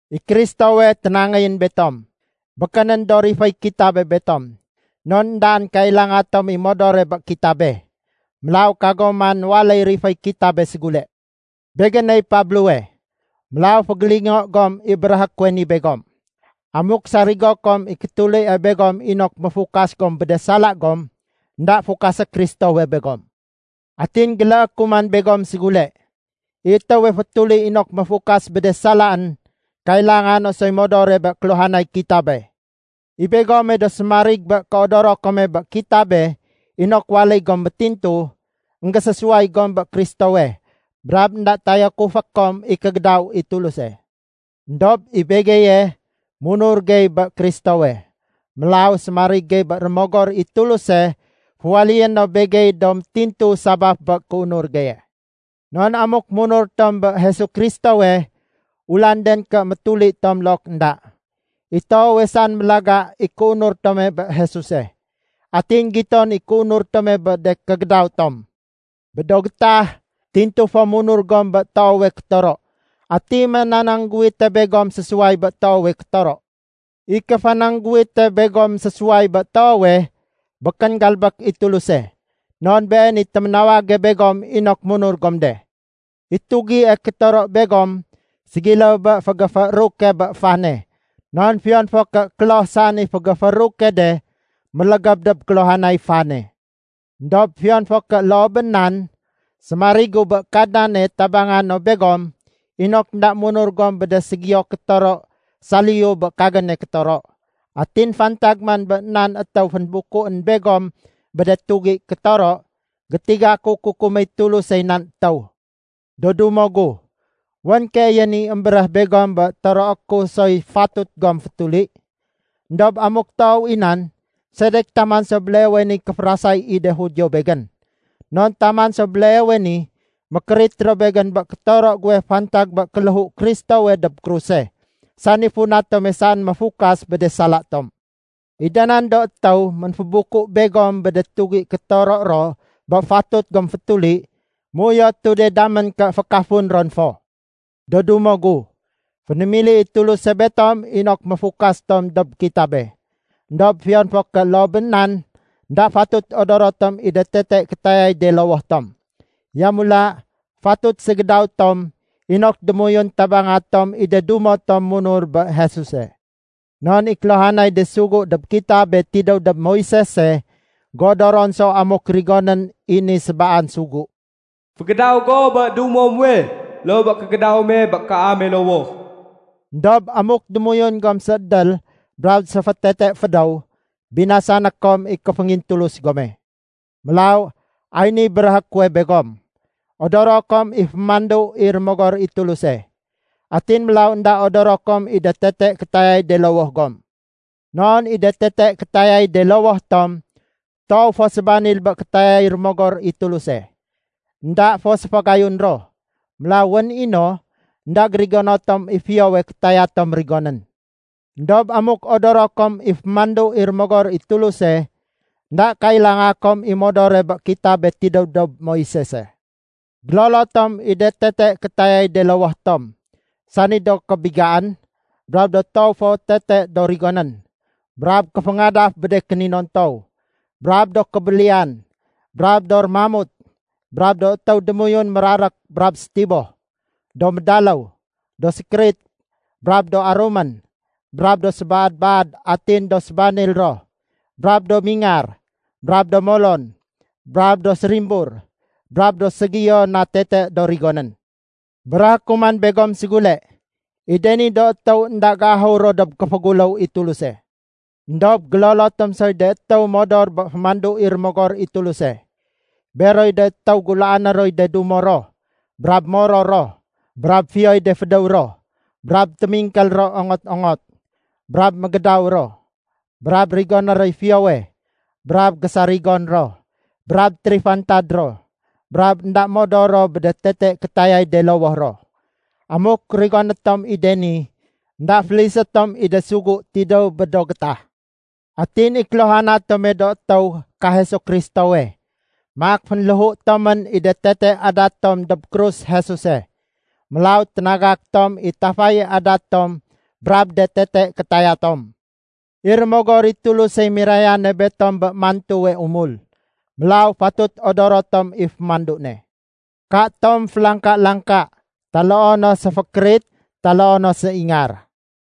I Kristowe ténangéyén betom. Békénén do riféy kitabe betom. Non éndaén kailanga tom i modore bé kitabe. Mélaw kagom man waléy riféy kitabe ségule. Begéney Pablowe, mélaw fégélingo gom i béréhé kuwe ni begom. Amuk sarigo kom i kétulie begom inok méfukas gom bé de sala gom, énda fukasé Kristowe begom. Atin géléé ku man begom ségule. I étéwe fétuli inok méfukas bé de salaén, kailanga no soy modore bé kéluhanay kitabe. I begome do sémarig bé kéodoro kome bé kitabe inok waléy gom métintu, énggésésuway gom bé Kristowe, brab énda tayakufé kom i kégédaw i Tuluse. Endob i begeye, munur gey bé Kristowe. Mélaw sémarig gey bé Rémogor i Tuluse féwaléyé no begey do métintu sabaf bé kéunur geye. Non amuk munur tom bé Jesu Kristowe, ulanden ké métuli tom look énda. I toowe saén mélaga i kéunur tome bé Jesuse. Atin giton i kéunur tome bé de kégédaw tom. Bé do gétah, tintu fo munur gom bé toowe kétoro. Ati ménanangguwite begom sésuway bé toowe kétoro? I kéfanangguwite begom sésuway bé toowe, békén galbék i Tuluse. Non Been i téménawage begom inok munur gom de. I tugie kétoro begom ségiléw bé fégéfééruke bé fane. Non fiyon fo ké kloh saén i fégéfééruke de, mélégéb dob kéluhanay fane. Endob fiyon fo ké loo bé nan, sémarigu bé Kadnane tabanga no begom inok énda munur gom bé de ségiyo kétoro saliyu bé kagéne kétoro. Atin fantag man bé nan étéw fénbukuén begom bé de tugi kétoro, gétiga ku kukuméy Tulusey nan étéw. Do dumo gu, wén keeyén i émbéréh begom bé toroé ku soy fatut gom fétuli. Endob amuk toow i nan, sedek taman so béleewe niy kéférasay i de Judio begén? Non taman so béleewe ni, mékérit ro begén bé kétoro guwe fantag bé kéléhu Kristowe dob kruse, sani funa tome saén méfukas bé de sala tom. I da nan do étéw ménfébuku begom bé de tugi kétoro ro bé fatut gom fétuli, méuyotu de damén ké fékafun ron fo! Do dumo gu, fénémili i Tuluse betom inok méfukas tom dob kitabe. Endob fiyon fo ké loo bé nan, énda fatut odoro tom i de tete kétayay de lowoh tom. Yamula fatut ségédaw tom inok démoyun tabanga tom i de dumo tom munur bé Jesuse. Non i kéluhanay de sugu dob kitabe tidéw dob Moisese géodoron so amuk rigonén i ni sébaan sugu, “Fégédaw go bé dumo muwe, loo bé kégédaw me bé kaame lowoh.” Endob amuk démoyun gom séédél brab séfétete fédéw, binasané kom i kéféngintulus gome. Mélaw ay niy béréhé kuwe begom: odoro kom i fémandu i Rémogor i Tuluse, atin mélaw énda odoro kom i de tete kétayay de lowoh gom. Non i de tete kétayay de lowoh tom toow fo sébanil bé kétayay Rémogor i Tuluse. Enda fo séfagayun ro. Mélaw wén i no, énda gérigono tom i fiyowe kétaya tom rigonén. Endob amuk odoro kom i fémandu i Rémogor i Tuluse, énda kailanga kom i modore bé kitabe tidéw dob Moisese. Gélolo tom i de tete kétayay de lowoh tom, sani do kébigaén, brab do toow fo tete do rigonén, brab kéféngadaf bé de kéninontow, brab do kébéliyan brab do rémamut, brab do étéw démoyun mérarék brab sétiboh, do médaléw, do sékérit, brab do arumén, brab do sébaad-baad atin do sébanil ro, brab do mingar, brab do molon, brab do sérimbur, brab do ségiyo na tete do rigonén. Béréhé ku man begom ségule, i de ni do étéw énda géahur ro dob kéféguléw i Tuluse. Endob gélolo tom soy de étéw modor bé fémandu i Rémogor i Tuluse. Beroy de étéw gulaané roy de dumo ro, brab moror ro, brab fiyoy de fédéw ro, brab témingkél ro ongot-ongot, brab mégédaw ro, brab rigoné roy fiyowe, brab gésarigon ro, brab térifantad ro, brab énda modor ro bé de tete kétayay de lowoh ro. Amuk rigoné tom i de ni, énda félisé tom i de sugu tidéw bé do gétah. Atin i kéluhana tome do étéw ka Jesu Kristowe, maak fénléhu tomén i de tete adat tom dob krus Jesuse. Mélaw ténagak tom i tafaye adat tom brab de tete kétaya tom. I Rémogor i Tulusey mirayane betom bé mantuwe umul, mélaw fatut odoro tom i fémandu ne. Katom félangka-langka, taloo no séfékérit taloo no séingar.